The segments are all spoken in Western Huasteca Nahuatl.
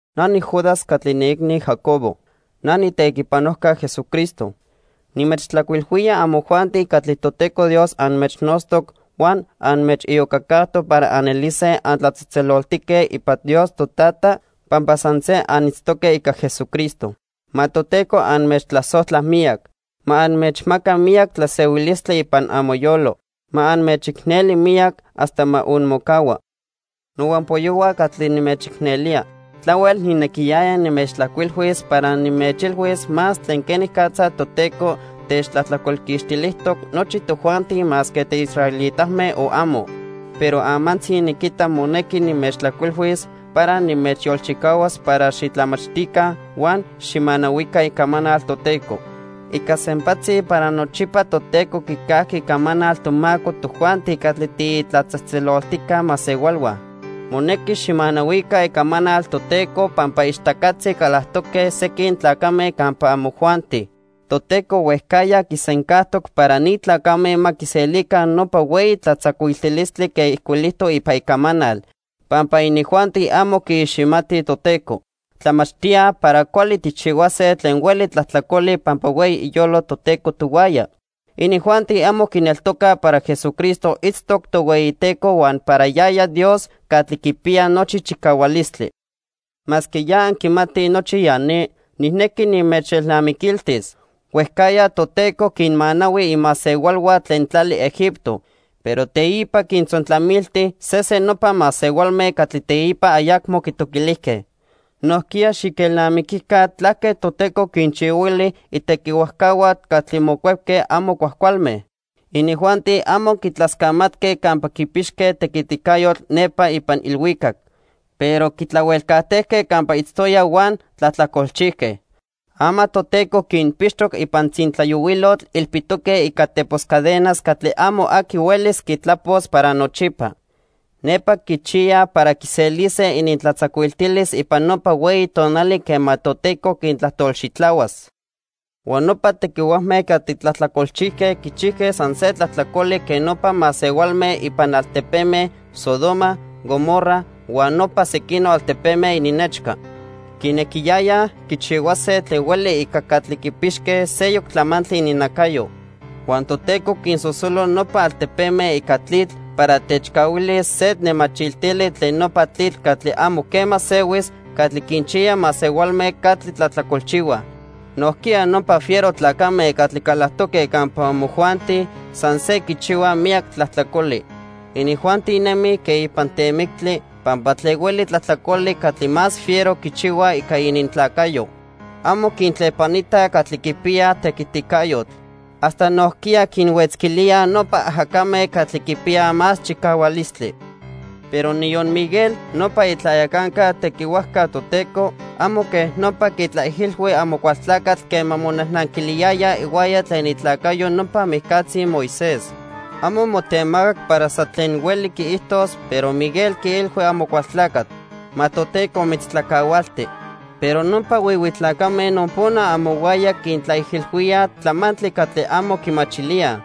Na niJudas catli niiicni Jacobo. Na niitequipanojca Jesucristo. Nimechtlajcuilhuía amojuanti catli Toteco Dios anmechnotztoc huan anmechiyocacajtoc para anelise antlatzejtzeloltique ipan Dios Totata pampa san se anitztoque ica Jesucristo. Ma Toteco anmechtlasojtla miyac. Ma anmechmaca miyac tlasehuilistli ipan amoyolo. Ma anmechicneli miyac hasta ma onmocahua. Nohuampoyohua catli nimechicnelía, tlahuel nijnequiyaya nimechtlajcuilhuis para nimechilhuis más tlen quenicatza Toteco techtlajtlacolquixtilijtoc nochi tojuanti masque tiisraelitame o amo. Pero amantzi niquita monequi nimechtlajcuilhuis para nimechyolchicahuas para xitlamachtica huan xijmanahuica icamanal Toteco. Ica sempatzi para nochipa Toteco quicajqui icamanal tomaco tojuanti catli tiitlatzejtzeloltijca masehualhua. Monequi xijmanahuica icamanal Toteco pampa ichtacatzi calactoque sequin tlacame campa amojuanti. Toteco huejcajya quisencajtoc para ni tlacame ma quiselica nopa hueyi tlatzacuiltilistli quen ijcuilijtoc ipan Icamanal, pampa inijuanti amo quiiximatij Toteco. Tlamachtíaj para cuali tijchihuase tlen hueli tlajtlacoli pampa hueyi iyolo Toteco tohuaya. Inijuanti amo quineltocaj para Jesucristo itztoc Tohueyiteco huan para yaya Dios Catli Quipiya Nochi Chicahualistli. Masque ya anquimatij nochi ya ni, nijnequi nimechelnamiquiltis. Huejcajya Toteco quinmanahui imasehualhua tlen tlali Egipto, pero teipa quintzontlamilti sesen nopa masehualme catli teipa ayacmo quitoquilijque. Nojquiya xiquelnamiquica tlaque Toteco quinchihuili itequihuajcahua catli mocuepque amo cuajcualme. Inijuanti amo quitlascamatque campa quipixque tequiticayotl nepa ipan ilhuicac, pero quitlahuelcajtejque campa itztoyaj huan tlajtlacolchijque. Ama Toteco quinpixtoc ipan tzintlayohuilotl ilpitoque ica tepos cadenas catli amo aqui huelis quitlapos para nochipa. Nepa quichiyaj para quiselise inintlatzacuiltilis ipan nopa hueyi tonali quema Toteco quintlajtolxitlahuas. Huan nopa tequihuajme catli tlajtlacolchijque quichijque san se tlajtlacoli quen nopa masehualme ipan altepeme Sodoma, Gomorra huan nopa sequinoc altepeme ininnechca. Quinequiyayaj quichihuase tlen hueli ica catli quipixque seyoc tlamantli ininnacayo. Huan Toteco quinsosolo nopa altepeme ica tlitl para techcahuilis se nemachiltili tlen nopa tlitl catli amo quema sehuis catli quinchiya masehualme catli tlajtlacolchihuaj. Nojquiya nopa fiero tlacame catli calactoque campa amojuanti san se quichihuaj miyac tlajtlacoli. Inijuanti nemij quen ipan temictli, pampa tlen hueli tlajtlacoli catli más fiero quichihuaj ica inintlacayo. Amo quintlepanitaj catli quipiyaj tequiticayotl. Hasta nojquiya quinhuetzquilíaj nopa ajacame catli quipiyaj más chicahualistli. Pero niyon Miguel, nopa itlayacanca tequihuajca Toteco, amo quej nopa quitlaijilhui Amocualtlacatl quema monajnanquiliyaya ihuaya tlen itlacayo nopa mijcatzi Moisés. Amo motemacac para san tlen hueli quiijtos, pero Miguel quiilhui Amocualtlacatl: "Ma Toteco mitztlacahualti." Pero nopa huihui tlacame nopona amohuaya quintlaijilhuíaj tlamantli catli amo quimachilíaj.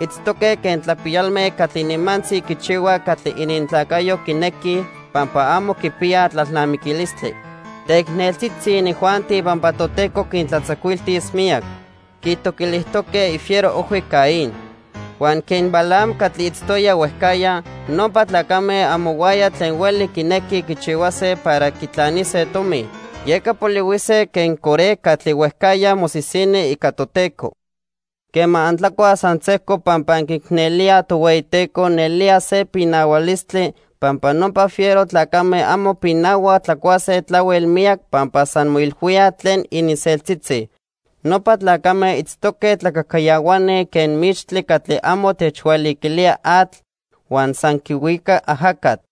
Itztoque quen tlapiyalme catli nimantzi quichihuaj catli inintlacayo quinequij pampa amo quipiyaj tlalnamiquilistli. Teicneltzitzi inijuanti pampa Toteco quintlatzacuiltis miyac. Quitoquilijtoque ifiero ojhui Caín. Huan quen Balaam catli itztoya huejcajya, nopa tlacame amohuaya tlen hueli quinequij quichihuase para quitlanise tomi. Yeca polihuise quen Coré catli huejcajya mosisini ica Toteco. Quema antlacuaj san sejco pampa anquiicnelíaj Tohueyiteco, nelía se pinahualistli, pampa nopa fiero tlacame amo pinahuaj tlacuase tlahuel miyac pampa san moilhuíaj tlen ininseltzitzi. Nopa tlacame itztoque tlacajcayahuani quen mixtli catli amo techhualiquilía atl huan san quihuica ajacatl.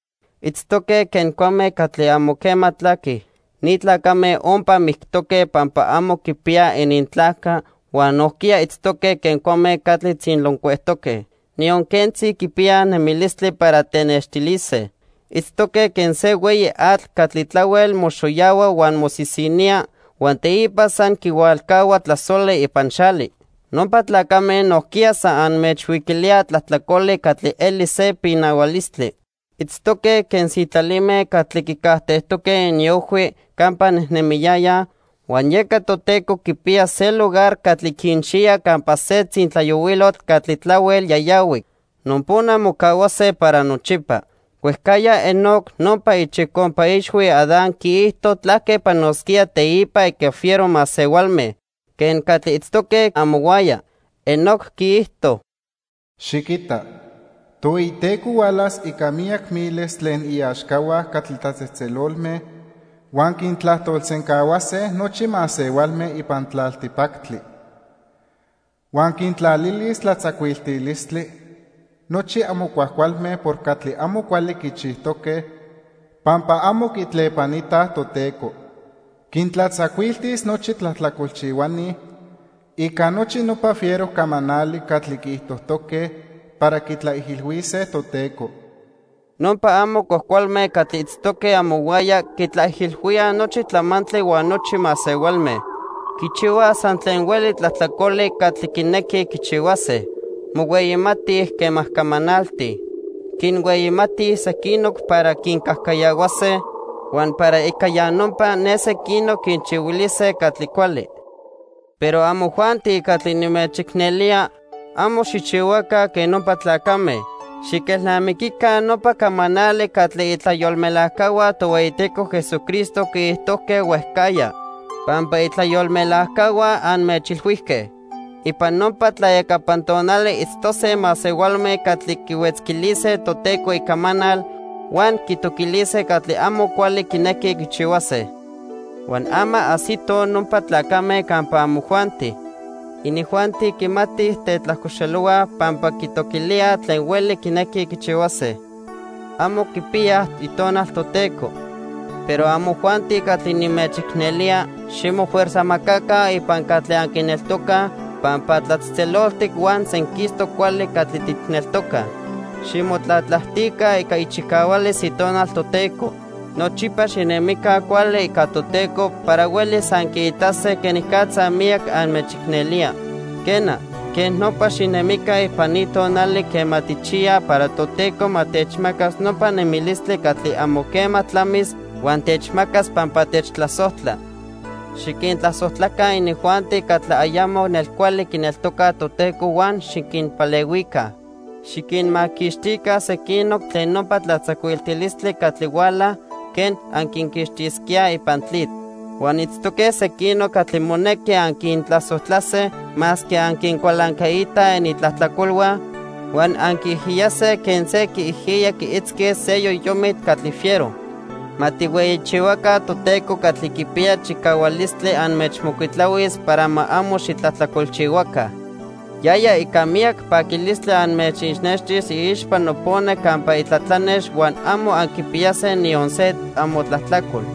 Itztoque quen cuame catli amo quema tlaquij. Ni tlacame ompa mictoque pampa amo quipiyaj inintlajca, huan nojquiya itztoque quen cuame catli tzinloncuejtoque. Niyon quentzi quipiyaj nemilistli para tenextilise. Itztoque quen se hueyi atl catli tlahuel moxoyahua huan mosisinía huan teipa san quihualcahua tlasoli ipan xali. Nopa tlacame nojquiya san anmechhuiquilíaj tlajtlacoli catli eli se pinahualistli. Itztoque quen sitlalime catli quicajtejtoque iniojhui campa nejnemiyayaj, huan yeca Toteco quipiya se lugar catli quinchiya campa se tzintlayohuilotl catli tlahuel yayahuic. Nopona mocahuase para nochipa. Huejcajya Enoc nopa ichicompa ixhui Adán quiijto tlaque panosquía teipa ica fiero masehualme quen catli itztoque amohuaya. Enoc quiijto: "Xiquita, Tohueyiteco hualas ica miyac miles tlen iaxcahua catli tlatzejtzelolme, huan quintlajtolsencahuase nochi masehualme ipan tlaltipactli. Huan quintlalilis tlatzacuiltilistli nochi amo cuajcualme por catli amo cuali quichijtoque pampa amo quitlepanitaj Toteco. Quintlatzacuiltis nochi tlajtlacolchihuani ica nochi nopa fiero camanali catli quiijtojtoque para quitlaijilhuise Toteco." Nopa amo cuajcualme catli itztoque amohuaya quitlaijilhuíaj nochi tlamantli huan nochi masehualme. Quichihuaj san tlen hueli tlajtlacoli catli quinequij quichihuase. Mohueyimatij quema camanaltij. Quinhueyimatij sequinoc para quincajcayahuase, huan para ica ya nopa, ne sequinoc quinchihuilise catli cuali. Pero amojuanti catli nimechicnelía, amo xijchihuaca quen nopa tlacame. Xiquelnamiquica nopa camanali catli itlayolmelajcahua Tohueyiteco Jesucristo quiijtojque huejcajya. Pampa itlayolmelajcahua anmechilhuijque: "Ipan nopa tlayacapan tonali itztose masehualme catli quihuetzquilise Toteco Icamanal huan quitoquilise catli amo cuali quinequij quichihuase." Huan ama ajsitoj nopa tlacame campa amojuanti. Inijuanti quimatij tetlajcoxelohuaj pampa quitoquilíaj tlen hueli quinequij quichihuase. Amo quipiyaj Itonal Toteco. Pero amojuanti catli nimechicnelía, ximofuerzajmacaca ipan catli anquineltocaj pampa tlatzejtzeloltic huan senquistoc cuali catli tijneltocaj. Ximotlatlajtica ica ichicahualis Itonal Toteco. Nochipa xinemica cuali ica Toteco para huelis anquiitase quenicatza miyac anmechicnelía. Quena, quej nopa xinemica ipan ni tonali quema tijchiyaj para Toteco ma techmacas nopa nemilistli catli amo quema tlamis huan techmacas pampa techtlasojtla. Xiquintlasojtlaca inijuanti catli ayamo nelcuali quineltocaj Toteco huan xiquinpalehuica. Xiquinmaquixtica sequinoc tlen nopa tlatzacuiltilistli catli huala quen anquinquixtisquíaj ipan tlitl. Huan itztoque sequinoc catli monequi anquintlasojtlase, masque anquicualancaitaj inintlajtlacolhua, huan anquiijiyase quen se quiijiya quiitzquis se yoyomitl catli fiero. Ma tijhueyichihuaca Toteco catli quipiya chicahualistli anmechmocuitlahuis para ma amo xitlajtlacolchihuaca. Yaya ica miyac paquilistli anmechixnextis iixpa nopona campa itlatlanex huan amo anquipiyase niyon se amotlajtlacol.